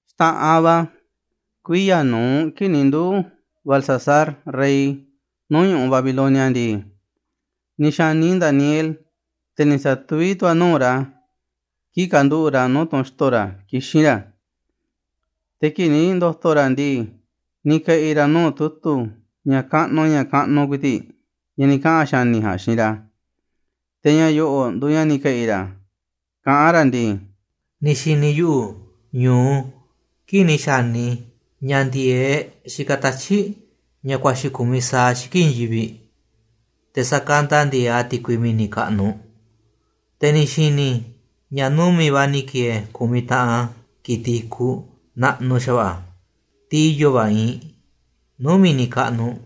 Xta̱ꞌanꞌ va̱, kuiya̱ nu̱uꞌ kii̱ꞌ ni̱ nduu̱ Belsasar rey nuu̱ꞌ ñu̱ꞌuꞌ Babilonia ndii, ni̱ xa̱ni Daniel, te̱ ni̱ sa̱tuví tu̱ a̱ nuu̱ꞌ ra̱ kii̱ꞌ kanduꞌu̱ꞌ ra̱ nuu̱ꞌ tunꞌ xto̱ ra̱ kixín ra̱. Te̱ kii̱ꞌ ni̱ ndo̱to̱ ra̱ ndii, ni̱ ke̱ꞌi̱ ra̱ nuu̱ꞌ tu̱tu̱ ña̱ kaꞌnuꞌ ña̱ kaꞌnuꞌ ku̱i̱ti̱ꞌ, ña̱ ni̱ kaꞌa̱n xa̱ni̱ ja̱a̱nꞌ xiinꞌ ra̱. Te̱ ña̱ yo̱ꞌo̱ꞌ nduuꞌ ña̱ ni̱ ke̱ꞌi̱ ra̱, kaꞌán ra̱ ndii: “Ni̱ xi̱ni̱ yuꞌu̱ ñu̱u kii̱ꞌ ni̱ xa̱ni i̱ ña̱ ndi̱e̱eꞌ xikaꞌ tatyi̱ꞌ ña̱ kuaxi̱ ku̱mi sa̱aꞌ xiki̱ꞌ i̱i̱n yivi̱ꞌ, te̱ sa̱kanda ndi̱e̱eꞌ a̱ ti̱kui mi̱ni̱ kaꞌnuꞌ. Te̱ ni̱ xi̱ni̱ i̱ ña̱ numi̱ꞌ va̱ ni̱ ki̱e̱e̱ ku̱miꞌ taꞌan ki̱tiꞌ i̱kuꞌ naꞌnuꞌ xa̱va̱ꞌa̱, tiꞌ i̱yo̱ va̱ iinꞌ, nuu̱ꞌ mi̱ni̱ kaꞌnuꞌ,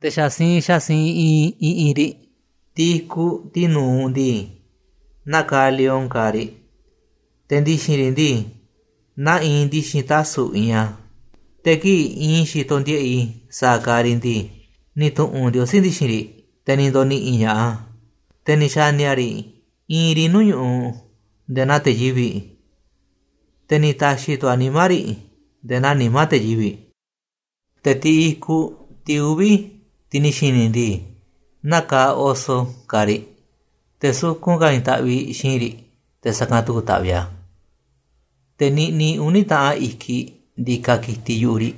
te̱ xa̱ siinꞌ xa̱ siinꞌ iinꞌ i̱ꞌi̱n riꞌ. Tiꞌ i̱kuꞌ, tiꞌ nu̱uꞌ ndii, naa kaaꞌ lion kaaꞌ riꞌ, te̱ ndi̱xi̱n riꞌ ndii, naa iinꞌ ndi̱xi̱n tasu̱ꞌ iinꞌ a̱. Te̱ kii̱ꞌ iinꞌ i̱ xitoꞌ ndiꞌe̱ꞌ i̱ sa̱a̱ kaaꞌ riꞌ ndii, ni̱ tu̱ꞌu̱n Ndiosí ndi̱xi̱n riꞌ, te̱ ni̱ ndo̱ni̱ꞌi̱ ña̱ꞌaꞌ a̱, te̱ ni̱ xa̱ni̱ a̱ riꞌ iinꞌ riꞌ nuu̱ꞌ ñu̱ꞌuꞌ nde̱e̱ na̱a̱ te̱ yivi̱ꞌ, te̱ ni̱ ta̱xi̱ tu̱ a̱ nimá riꞌ nde̱e̱ naa nimá te̱ yivi̱ꞌ. “Te̱ tiꞌ i̱kuꞌ, tiꞌ uvi̱, tiꞌ ni̱ xi̱ni̱ i̱ ndii, naa kaaꞌ oso kaaꞌ riꞌ, te̱ sukun ka̱ i̱i̱n taꞌviꞌ xi̱i̱nꞌ riꞌ te̱ sa̱kanꞌ tu̱ku̱ taꞌviꞌ a̱, te̱ niꞌniꞌ uni̱ taꞌan i̱kiꞌ ndikaꞌ ki̱tiꞌ yu̱ꞌuꞌ riꞌ.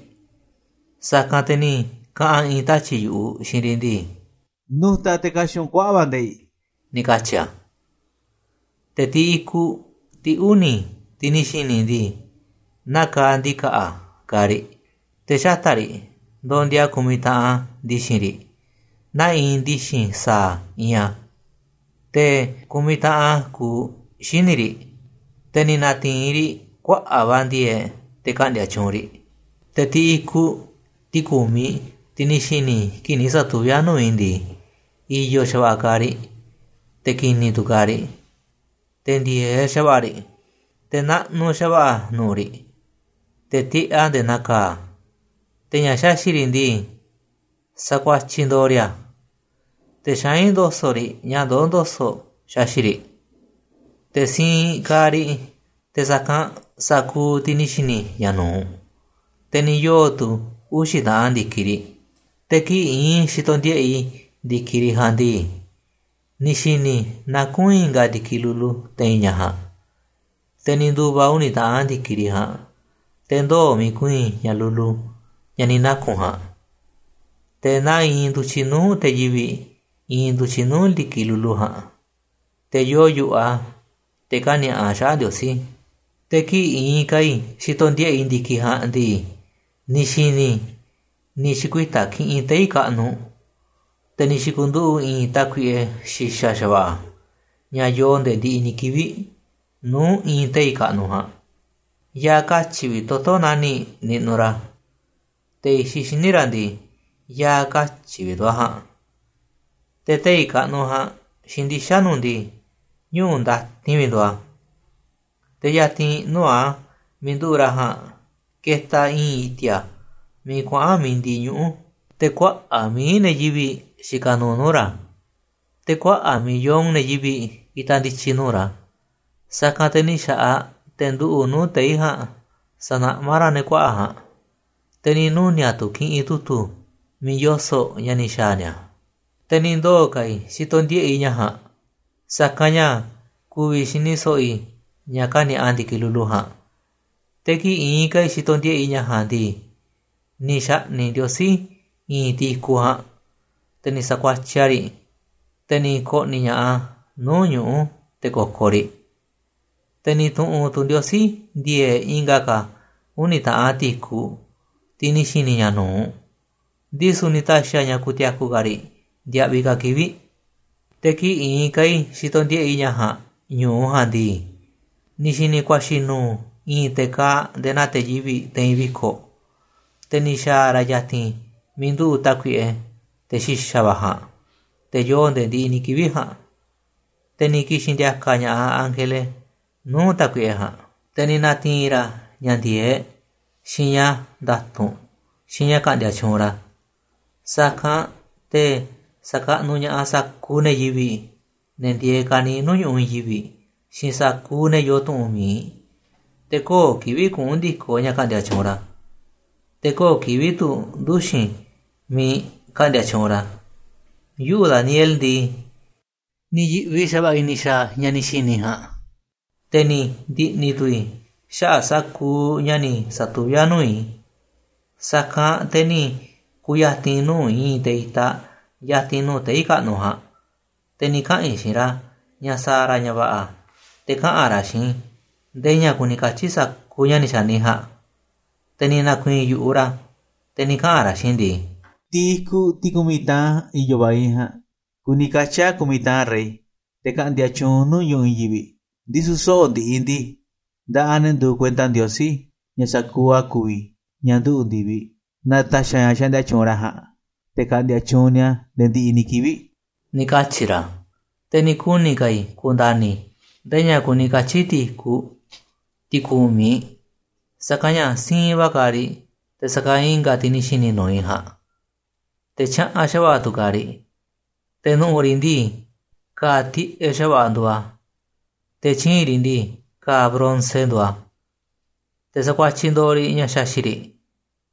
Sa̱kanꞌ te̱ ni̱ kaꞌa̱n i̱i̱n tatyi̱ꞌ yu̱ꞌuꞌ xiinꞌ riꞌ ndii: ‘Nu̱ta̱ te̱ ka̱xi̱ꞌ u̱nꞌ kuaꞌa̱ꞌ va̱ nde̱i̱ꞌ,’ ni̱ katyi̱ a̱. “Te̱ tiꞌ i̱kuꞌ, tiꞌ uni̱, tiꞌ ni̱ xi̱ni̱ i ndii, naa kaaꞌ ndi̱ka̱ꞌa̱ kaaꞌ riꞌ, te̱ xata̱ꞌ riꞌ ndondia ku̱miꞌ taꞌan ndi̱xi̱n riꞌ, naa iinꞌ ndi̱xi̱n sa̱a̱ iinꞌ a̱. Te̱ ku̱miꞌ taꞌan kuuꞌ xíniꞌ riꞌ. Te̱ ni̱ na̱ti̱i̱n riꞌ kuaꞌa̱ꞌ va̱ ndi̱e̱e̱ꞌ te̱ ka̱ꞌndi̱a̱ tyuunꞌ riꞌ. “Te̱ tiꞌ i̱kuꞌ, tiꞌ ku̱miꞌ, tiꞌ ni̱ xi̱ni̱ i̱ kii̱ꞌ ni̱ satuví a̱ nuu̱ꞌ i̱ ndii, i̱yo̱ xa̱va̱ꞌa̱ kaaꞌ riꞌ, te̱ ki̱ni̱ tu̱ kaaꞌ riꞌ, te̱ ndi̱e̱eꞌ xa̱va̱ꞌa̱ riꞌ. Te̱ naꞌnuꞌ xa̱va̱ꞌa̱ nu̱ꞌu̱ riꞌ, te̱ tiꞌeꞌ a̱ nde̱e̱ naa ka̱a̱, te̱ ña̱ xaxi̱ꞌ riꞌ ndii, sa̱kuatyiꞌ ndo̱o̱ riꞌ a̱, te̱ xaín ndo̱so̱ꞌ riꞌ ña̱ ndoó ndo̱so̱ꞌ xaxi̱ꞌ riꞌ. Te̱ siinꞌ kaaꞌ riꞌ te̱ sa̱kanꞌ sa̱kuuꞌ tiꞌ ni̱ xi̱ni̱ i̱ ña̱ nu̱uꞌ, te̱ ni̱ yoo̱ tu̱ uxi̱ taꞌan ndi̱kiꞌ riꞌ. “Te̱ kii̱ꞌ iinꞌ i̱ xitoꞌ ndiꞌe̱ꞌ i̱ ndi̱kiꞌ riꞌ ja̱a̱nꞌ ndii, ni̱ xi̱ni̱ i̱ nakún i̱nga̱ ndi̱kiꞌ lulu te̱i̱n ña̱ ja̱a̱nꞌ. Te̱ ni̱ ndu̱va̱ uni̱ taꞌan ndi̱kiꞌ riꞌ ja̱a̱nꞌ, te̱ ndoo̱ miiꞌ ku̱i̱i̱n ña̱ lulu, ña̱ ni̱ naku̱n ja̱a̱nꞌ. Te̱ naa iinꞌ ndu̱tyiꞌ nuu̱ꞌ te̱ yivi̱ꞌ iinꞌ ndu̱tyiꞌ nuu̱ꞌ ndi̱kiꞌ lulu ja̱a̱nꞌ, te̱ yoo yu̱ꞌuꞌ a̱, te̱ kani̱a̱ꞌa a̱ xaꞌa̱ꞌ Ndiosí. “Te̱ kii̱ꞌ iinꞌ ka̱ i̱ xitoꞌ ndiꞌe̱ꞌ i̱ ndi̱kiꞌ ja̱a̱nꞌ ndii, ni̱ xi̱ni̱ i̱ ni̱ xi̱kuita̱ kiꞌinꞌ tei̱ kaꞌnuꞌ. Te̱ ni̱ xi̱ku̱nduꞌu̱ꞌ i̱i̱n Tákuiꞌe xi̱xa̱ xa̱va̱ꞌa̱, ña̱ yoo nde̱e̱ ndiꞌiꞌ ni̱ kivi̱ꞌ, nuu̱ꞌ i̱i̱n tei̱ kaꞌnuꞌ ja̱a̱nꞌ. Ya̱a̱ katyi̱ vi̱ꞌ toto̱ nani̱ꞌ niꞌnuꞌ ra̱. Te̱ i̱xiꞌ xíniꞌ ra̱ ndii, ya̱a̱ katyi̱ vi̱ꞌ tu̱ a̱ ja̱a̱nꞌ. Te̱ tei̱ kaꞌnuꞌ ja̱a̱nꞌ xiinꞌ ndixa̱nꞌ nuꞌ ndii, ñuꞌu̱ ndatinꞌ vi̱ꞌ nduuꞌ a̱. Te̱ ya̱ti̱n nuu̱ꞌ a̱ miiꞌ nduꞌu̱ꞌ ra̱ ja̱a̱nꞌ ketaꞌ i̱i̱n i̱ti̱a̱ miiꞌ kuaꞌa̱n mi̱iꞌ ndiꞌiꞌ ñuꞌu̱. Te̱ kuaꞌa̱ꞌ mií ne̱ yivi̱ꞌ xikaꞌ nuuꞌ nuu̱ꞌ ra̱, te̱ kuaꞌa̱ꞌ millón ne̱ yivi̱ꞌ itaꞌ ndi̱tyi̱ nuu̱ꞌ ra̱. Sa̱kanꞌ te̱ ni̱ xa̱ꞌaꞌ te̱ nduꞌu̱ꞌ nuu̱ꞌ tei̱ ja̱a̱nꞌ sanaꞌmá ra̱ ne̱ kuaꞌa̱ꞌ ja̱a̱nꞌ, te̱ ni̱ nuni̱a̱ꞌ tu̱ kiꞌinꞌ tu̱tu̱ miiꞌ yoso̱ꞌ ña̱ ni̱ xa̱a̱ ni̱a̱. “Te̱ ni̱ ndoo̱ ka̱ i̱ xitoꞌ ndiꞌe̱ꞌ i̱ ña̱ ja̱a̱nꞌ, sa̱kanꞌ ña̱ ku̱vi̱ xini so̱ꞌo̱ i̱ ña̱ kani̱a̱ꞌa ndi̱kiꞌ lulu ja̱a̱nꞌ. Te̱ kii̱ꞌ iinꞌ ka̱ i̱ xitoꞌ ndiꞌe̱ꞌ i̱ ña̱ ja̱a̱nꞌ ndii, ni̱ xa̱ꞌni̱ꞌ Ndiosí i̱i̱n tiꞌ i̱kuꞌ ja̱a̱nꞌ. Te̱ ni̱ sa̱kuatyiꞌ a̱ riꞌ, te̱ ni̱ ko̱ꞌni̱ ña̱ꞌaꞌ a̱ nuu̱ꞌ ñuꞌu̱ te̱ ko̱ko̱ riꞌ. Te̱ ni̱ tu̱ꞌu̱n tu̱ Ndiosí ndi̱e̱e̱ꞌ i̱nga̱ ka̱ uni̱ taꞌan tiꞌ i̱kuꞌ, tiꞌ ni̱ xi̱ni̱ i̱ ña̱ nu̱uꞌ, ndisu̱ ni̱ ta̱xi̱ a̱ ña̱ ku̱ti̱a̱ku̱ ka̱ riꞌ ndiaꞌviꞌ ka̱ kivi̱ꞌ. “Te̱ kii̱ꞌ iinꞌ ka̱ i̱ xitoꞌ ndiꞌe̱ꞌ i̱ ña̱ ja̱a̱nꞌ ñu̱u ja̱a̱nꞌ ndii. Ni̱ xi̱ni̱ i̱ kuaxi̱ nu̱u̱ i̱i̱n te̱ kaaꞌ nde̱e̱ naa te̱ yivi̱ꞌ te̱i̱n viko̱ꞌ, te̱ ni̱ xa̱a̱ ra̱ ya̱ti̱n miiꞌ nduꞌu̱ꞌ Tákuiꞌe, te̱ xi̱xa̱ va̱ ja̱a̱nꞌ, te̱ yoo nde̱e̱ ndiꞌiꞌ ni̱ kivi̱ꞌ ja̱a̱nꞌ, te̱ ni̱ ki̱xi̱n ndi̱a̱ka̱ ña̱ꞌaꞌ ángele nuu̱ꞌ Tákuiꞌe ja̱a̱nꞌ. Te̱ ni̱ na̱ti̱i̱n ra̱ ña̱ ndi̱e̱eꞌ, xiinꞌ ña̱ nda̱tu̱nꞌ, xiinꞌ ña̱ ka̱ꞌndi̱a̱ tyuunꞌ ra̱, sa̱kanꞌ te̱ sa̱kaꞌnuꞌ ña̱ꞌaꞌ sa̱kuuꞌ ne̱ yivi̱ꞌ, ne̱ ndieeꞌ ka̱niiꞌ nuu̱ꞌ ñu̱ꞌuꞌ i̱i̱n yivi̱ꞌ, xiinꞌ sa̱kuuꞌ ne̱ yoo tu̱ꞌu̱n miiꞌ. Te̱ köo̱ꞌ kivi̱ꞌ kuꞌu̱n ndi̱koꞌ ña̱ ka̱ꞌndi̱a̱ tyuunꞌ ra̱, te̱ köo̱ꞌ kivi̱ꞌ tu̱ nduxi̱n miiꞌ ka̱ꞌndi̱a̱ tyuunꞌ ra̱. “Yuꞌu̱ Daniel ndii, ni̱ yi̱ꞌvi xa̱va̱ꞌa̱ i̱ ni̱ xa̱a̱ ña̱ ni̱ xi̱ni̱ i̱ ja̱a̱nꞌ, te̱ ni̱ ndi̱ꞌni̱ tu̱ i̱ xaꞌa̱ꞌ sa̱kuuꞌ ña̱ ni̱ sa̱tuví a̱ nuu̱ꞌ i̱. Sa̱kanꞌ te̱ ni̱ ku̱ya̱ti̱n i̱ nuu̱ꞌ i̱i̱n te̱ itaꞌ ya̱ti̱n nuu̱ꞌ tei̱ kaꞌnuꞌ ja̱a̱nꞌ, te̱ ni̱ kaꞌa̱n i̱ xiinꞌ ra̱ ña̱ sa̱a̱ ra̱ ña̱ va̱ꞌa̱ te̱ kaꞌa̱n ra̱ xiinꞌ i̱ ndee ña̱ kuni katyi̱ sa̱kuuꞌ ña̱ ni̱ xa̱ni i̱ ja̱a̱nꞌ. Te̱ ni̱ na̱ku̱i̱i̱n yu̱ꞌuꞌ ra̱, te̱ ni̱ kaꞌa̱n ra̱ xiinꞌ i̱ ndii: ‘Tiꞌ i̱kuꞌ, tiꞌ ku̱miꞌ taꞌan i̱yo̱ va̱ iinꞌ ja̱a̱nꞌ kuni katyi̱ a̱ ku̱miꞌ taꞌan rey, te̱ ka̱ꞌndi̱a̱ tyuunꞌ nuu̱ꞌ ñu̱ꞌuꞌ i̱i̱n yivi̱ꞌ. Ndisu̱ soꞌo̱ꞌ ndiꞌiꞌ ndii, nda̱ꞌaꞌ ne̱ nduuꞌ kuenta Ndiosí, ña̱ sa̱kuuꞌ a̱ ku̱vi̱, ña̱ nduꞌu̱ ndi̱viꞌ, na̱ta̱xi̱ a̱ ña̱ xaꞌndia tyuunꞌ ra̱ ja̱a̱nꞌ, te̱ ka̱ꞌndi̱a̱ tyuunꞌ ni̱a̱ nde̱e̱ ndiꞌiꞌ ni̱ kivi̱ꞌ,’ ni̱ katyi̱ ra̱. “Te̱ ni̱ kuni̱ ka̱ i̱ ku̱nda̱ni̱ i̱ ndee ña̱ kuni katyi̱ tiꞌ i̱kuꞌ, tiꞌ ku̱miꞌ, sa̱kanꞌ ña̱ siinꞌ va̱ kaaꞌ riꞌ te̱ sa̱kanꞌ i̱nga̱ tiꞌ ni̱ xi̱ni̱ nu̱uꞌ i̱ ja̱a̱nꞌ, te̱ tyaꞌanꞌ xa̱va̱ꞌa̱ tu̱ kaaꞌ riꞌ. Te̱ nu̱ꞌu̱ riꞌ ndii, ka̱a̱ tiꞌeꞌ xa̱va̱ꞌa̱ nduuꞌ a̱, te̱ tyii̱nꞌ riꞌ ndii, ka̱a̱ bronce nduuꞌ a̱, te̱ sakuatyiꞌ ndo̱o̱ riꞌ ña̱ xaxi̱ꞌ riꞌ,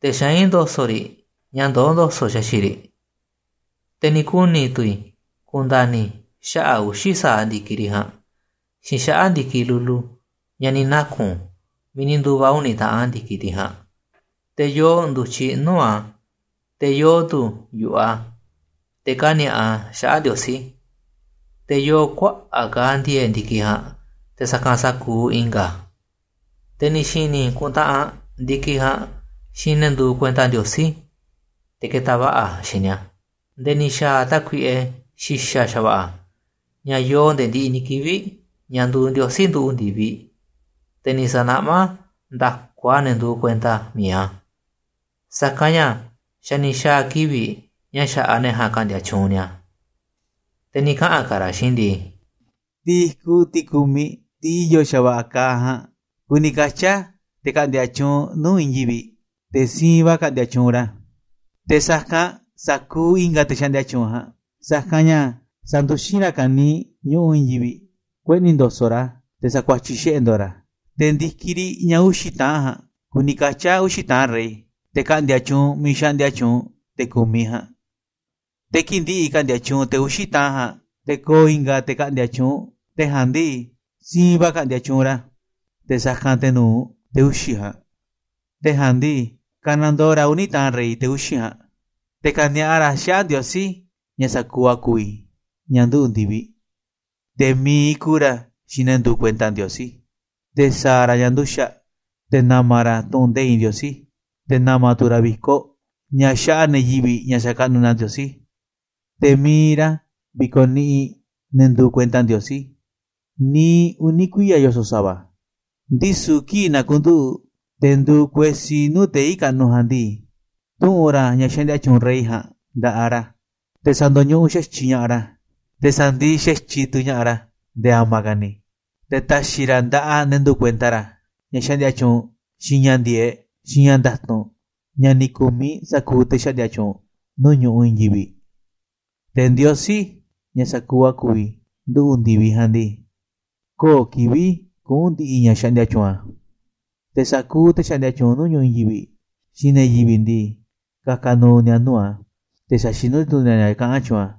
te̱ xaín ndo̱so̱ꞌ riꞌ ña̱ ndoó ndo̱so̱ꞌ xaxi̱ꞌ riꞌ. Te̱ ni̱ kuni̱ tu̱ i̱ ku̱nda̱ni̱ i̱ xaꞌa̱ꞌ uxi̱ sa̱aꞌ ndi̱kiꞌ riꞌ ja̱a̱nꞌ, xiinꞌ xaꞌa̱ꞌ ndi̱kiꞌ lulu, ña̱ ni̱ naku̱n miiꞌ ni̱ ndu̱va̱ uni̱ taꞌan ndi̱kiꞌ tiꞌ ja̱a̱nꞌ, te̱ yoo ndu̱tyiꞌ nuu̱ꞌ a̱, te̱ yoo tu̱ yu̱ꞌuꞌ a̱, te̱ kani̱a̱ꞌa a̱ xaꞌa̱ꞌ Ndiosí. Te̱ yoo kuaꞌa̱ꞌ ka̱ ndi̱e̱e̱ꞌ ndi̱kiꞌ ja̱a̱nꞌ te̱ sa̱kanꞌ sa̱kuuꞌ i̱nga̱ a̱. Te̱ ni̱ xi̱ni̱ i̱ kuntaꞌanꞌ ndi̱kiꞌ ja̱a̱nꞌ xiinꞌ ne̱ nduuꞌ kuenta Ndiosí, te̱ ketaꞌ va̱ꞌa̱ a̱ xiinꞌ ni̱a̱, nde̱e̱ ni̱ xa̱a̱ tákuiꞌe xi̱xa̱ xa̱va̱ꞌa̱, ña̱ yoo nde̱e̱ ndiꞌiꞌ ni̱ kivi̱ꞌ, ña̱ nduuꞌ Ndiosí nduꞌu̱ꞌ ndi̱viꞌ, te̱ ni̱ sa̱naꞌmá nda̱ku a̱ ne̱ nduuꞌ kuenta mi̱iꞌ a̱, sa̱kanꞌ ña̱ xa̱ ni̱ xa̱a̱ kivi̱ꞌ ña̱ xa̱ꞌaꞌ ne̱ ja̱a̱nꞌ ka̱ꞌndi̱a̱ tyuunꞌ ni̱a̱. “Te̱ ni̱ kaꞌa̱n ka̱ ra̱ xiinꞌ i̱ ndii: ‘Tiꞌ i̱kuꞌ, tiꞌ ku̱miꞌ, tiꞌ i̱yo̱ xa̱va̱ꞌa̱ kaaꞌ ja̱a̱nꞌ, kuni katyi̱ a̱ te̱ ka̱ꞌndi̱a̱ tyuunꞌ nuu̱ꞌ i̱i̱n yivi̱ꞌ, te̱ siinꞌ va̱ ka̱ꞌndi̱a̱ tyuunꞌ ra̱ te̱ sa̱kanꞌ sa̱kuuꞌ i̱nga̱ te̱ xaꞌndia tyuunꞌ ja̱a̱nꞌ, sa̱kanꞌ ña̱ sa̱nduxín ra̱ ka̱niiꞌ ñu̱ꞌuꞌ i̱i̱n yivi̱ꞌ, kueꞌni̱ ndo̱so̱ꞌ ra̱ a̱, te̱ sa̱kuatyiꞌ xiꞌe̱ ndo̱o̱ ra̱ a̱. Te̱ ndi̱kiꞌ riꞌ, ña̱ uxi̱ taꞌan ja̱a̱nꞌ, kuni katyi̱ a̱ uxi̱ taꞌan rey, te̱ ka̱ꞌndi̱a̱ tyuunꞌ miiꞌ xaꞌndia tyuunꞌ, te̱ ku̱miꞌ ja̱a̱nꞌ. Te̱ kii̱ꞌ ndi̱ꞌi̱ ka̱ꞌndi̱a̱ tyuunꞌ te̱ uxi̱ taꞌan ja̱a̱nꞌ, te̱ ko̱o̱ i̱nga̱ te̱ ka̱ꞌndi̱a̱ tyuunꞌ, te̱ ja̱a̱nꞌ ndii, siinꞌ va̱ ka̱ꞌndi̱a̱ tyuunꞌ ra̱ te̱ sa̱kanꞌ te̱ nu̱uꞌ, te̱ uxi̱ ja̱a̱nꞌ, te̱ ja̱a̱nꞌ ndii, ka̱nandoo ra̱ uni̱ taꞌan rey, te̱ uxi̱ ja̱a̱nꞌ. Te̱ ka̱ni̱a̱ꞌa ra̱ xaꞌa̱ꞌ Ndiosí, ña̱ sa̱kuuꞌ a̱ ku̱vi̱, ña̱ nduꞌu̱ꞌ ndi̱viꞌ, te̱ mi̱iꞌ ku̱u̱ ra̱ xiinꞌ ne̱ nduuꞌ kuenta Ndiosí, te̱ sa̱a̱ ra̱ ña̱ nduxa̱ꞌ te̱ na̱ma̱ ra̱ tu̱ꞌu̱n nde̱iꞌ Ndiosí, te̱ na̱ma̱ tu̱ ra̱ vi̱koꞌ, ña̱ xaꞌa ne̱ yivi̱ꞌ ña̱ xakaꞌnuꞌ ni̱a̱ Ndiosí. Te̱ mi̱iꞌ ra̱ vi̱ko̱ niꞌiꞌ ne̱ nduuꞌ kuenta Ndiosí, niiꞌ uni̱ kuiya̱ yoso̱ꞌ sa̱va̱. Ndisu̱ kii̱ꞌ na̱ku̱nduꞌu̱ꞌ, te̱ nduuꞌ kuesí nuu̱ꞌ tei̱ kaꞌnuꞌ ja̱a̱nꞌ ndii, tu̱ꞌu̱n ra̱ ña̱ xaꞌndia tyuunꞌ rey ja̱a̱nꞌ nda̱ꞌaꞌ ra̱, te̱ sa̱ndo̱ñuꞌuꞌ xa̱tyiꞌ ña̱ꞌaꞌ ra̱, te̱ sa̱ndiꞌiꞌ xa̱tyiꞌ tu̱ ña̱ꞌaꞌ ra̱ nde̱e̱ a̱ma̱ ka̱ ni̱. Te̱ ta̱xi̱ ra̱ nda̱ꞌaꞌ ne̱ nduuꞌ kuenta ra̱ ña̱ xaꞌndia tyuunꞌ, xiinꞌ ña̱ ndi̱e̱eꞌ, xiinꞌ ña̱ nda̱tu̱nꞌ, ña̱ ni̱ ku̱miꞌ sa̱kuuꞌ te̱ xaꞌndia tyuunꞌ nuu̱ꞌ ñu̱ꞌuꞌ i̱i̱n yivi̱ꞌ. Te̱ Ndiosí, ña̱ sa̱kuuꞌ a̱ ku̱vi̱, nduꞌu̱ ndi̱viꞌ ja̱a̱nꞌ ndii, köo̱ꞌ kivi̱ꞌ kuꞌu̱n ndi̱ꞌi̱ ña̱ xaꞌndia tyuunꞌ a̱, te̱ sa̱kuuꞌ te̱ xaꞌndia tyuunꞌ nuu̱ꞌ ñu̱ꞌuꞌ i̱i̱n yivi̱ꞌ, xiinꞌ ne̱ yivi̱ꞌ ndii, ka̱ka̱ nu̱u̱ ni̱a̱ nuu̱ꞌ a̱, te̱ sa̱xinú tu̱ ni̱a̱ ña̱ kaꞌán tyuunꞌ a̱,’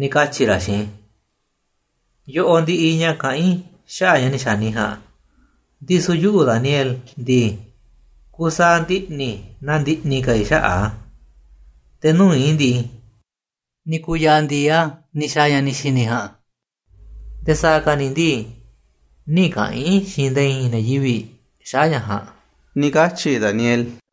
ni̱ katyi̱ ra̱ xiinꞌ i̱. “Yoꞌoꞌ ndiꞌiꞌ ña̱ kaꞌán i̱ xaꞌa̱ꞌ ña̱ ni̱ xa̱ni i̱ ja̱a̱nꞌ. Ndisu̱ yuꞌu̱, Daniel ndii, kusaaꞌ ndiꞌni̱ na ndiꞌni̱ ka̱ i̱ xaꞌa̱ꞌ a̱, te̱ nuu̱ꞌ i̱ ndii, ni̱ ku̱ya̱a̱ ndi̱i a̱ ni̱ xa̱a̱ ña̱ ni̱ xi̱ni̱ i̱ ja̱a̱nꞌ, nde̱e̱ sa̱a̱ ka̱ ni̱ ndii, nï̱ kaꞌa̱n i̱ xiinꞌ nde̱e̱ i̱i̱n ne̱ yivi̱ꞌ xaꞌa̱ꞌ ña̱ ja̱a̱nꞌ,” ni̱ katyi̱ Daniel.